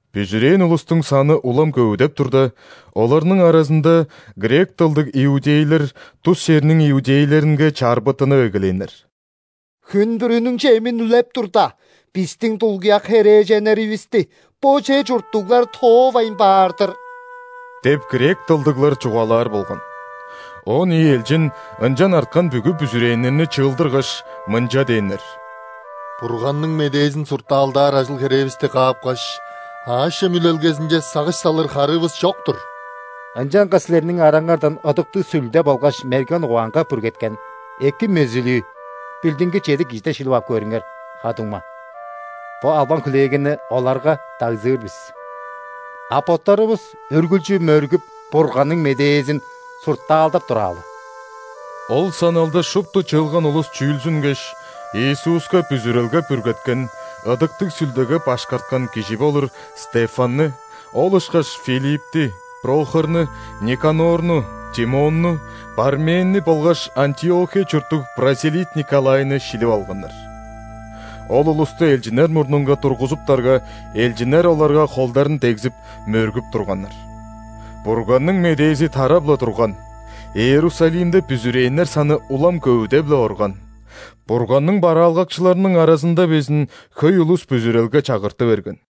Бүзүрээн улустуң саны улам көвүдеп турда, оларның аразында грек дылдыг иудейлер тус черниң иудейлеринге чарбыттынып эгелээннер. «Хүн бүрүнүң чемин үлеп турда, бистиң дулгуяк херээженнеривисти бо чер чурттуглар тоовайн баар-дыр» – деп, грек дылдыглар чугаалаар болган. Он ийи элчин ынчан арткан бүгү бүзүрээннерни чыылдыргаш, мынча дээннер: «Бурганның медээзин суртаалдаар ажыл-херээвисти каапкаш, аъш-чем үлелгезинче сагыш салыр харыывыс чок-тур. Ынчангаш силерниң араңардан Ыдыктыг Сүлде болгаш мерген угаанга бүргеткен, эки мөзүлүү билдингир чеди кижиден шилип ап көрүңер, ха-дуңма. Бо албан-хүлээлгени оларга дагзыр бис. А боттарывыс үргүлчү мөргүп, Бурганның медээзин суртаалдап тураалы». Ол саналды шупту чыылган улус чүүлзүнгеш, Иисуска бүзүрелге бүргеткен, Ыдыктыг Сүлдеге башкарткан кижи болур Стефанны, ол ышкаш Филиппти, Прохорну, Никанорну, Тимонну, Парменни болгаш Антиохия чурттуг ·прозелит Николайны шилип алганнар. Ол улусту элчиннер мурнунга тургузуптарга, элчиннер оларга холдарын дегзип, мөргүп турганнар. Бурганның медээзи тарап-ла турган, Иерусалимде бүзүрээннер саны улам көвүдеп-ле орган. Бурганның бараалгакчыларының аразында безин хөй улус бүзүрелге чагырты берген.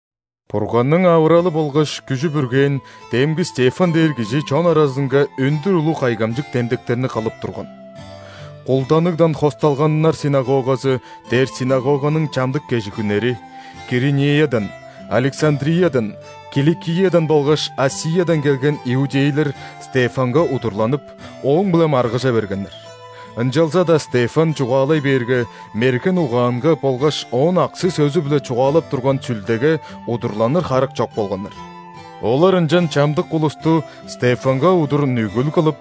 Бурганның авыралы болгаш күжү бүргээн демги Стефан дээр кижи чон аразынга өндүр улуг кайгамчык демдектерни кылып турган. «Кулданыгдан хосталганнар ·синагогазы» дээр синагоганың чамдык кежигүннери: Киринеядан, Александриядан, Киликиядан болгаш ·Асиядан келген иудейлер Стефанга удурланып, ооң-биле маргыжа бергеннер. Ынчалза-даа Стефан чугаалай бээрге, мерген угаанга болгаш ооң аксы-сөзү-биле чугаалап турган Сүлдеге удурланыр харык чок болганнар. Олар ынчан чамдык улусту Стефанга удур нүгүл кылып: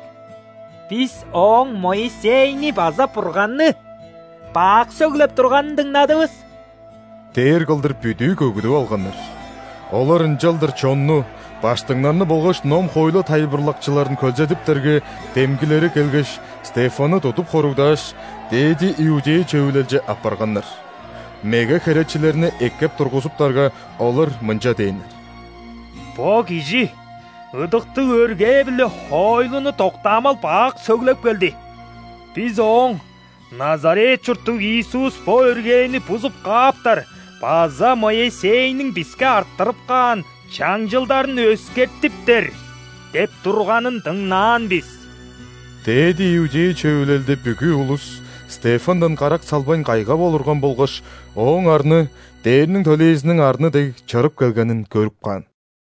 «Бис ооң Моисейни база Бурганны бак сөглеп турганын дыңнадывыс» – дээр кылдыр бүдүү көгүдүп алганнар. Олар ынчалдыр чонну, ·баштыңнарны болгаш ном-хоойлу тайылбырлакчыларын хөлзедиптерге, демгилери келгеш, Стефанны тудуп хоругдааш, ·дээди иудей Чөвүлелче аппарганнар. Меге херечилерни эккеп тургузуптарга, олар мынча дээннер: «Бо кижи ыдыктыг өргээ биле хоойлуну доктаамал бак сөглеп келди. Бис ооң: „Назарет чурттуг Иисус бо өргээни бузуп кааптар база Моисейниң биске арттырып каан чаңчылдарын өскертиптер“ – деп турганын дыңнаан бис». Дээди иудей Чөвүлелде бүгү улус Стефандан карак салбайн кайгап олурган болгаш, ооң арны, ·дээрниң төлээзиниң арны дег, чырып келгенин көрүп каан.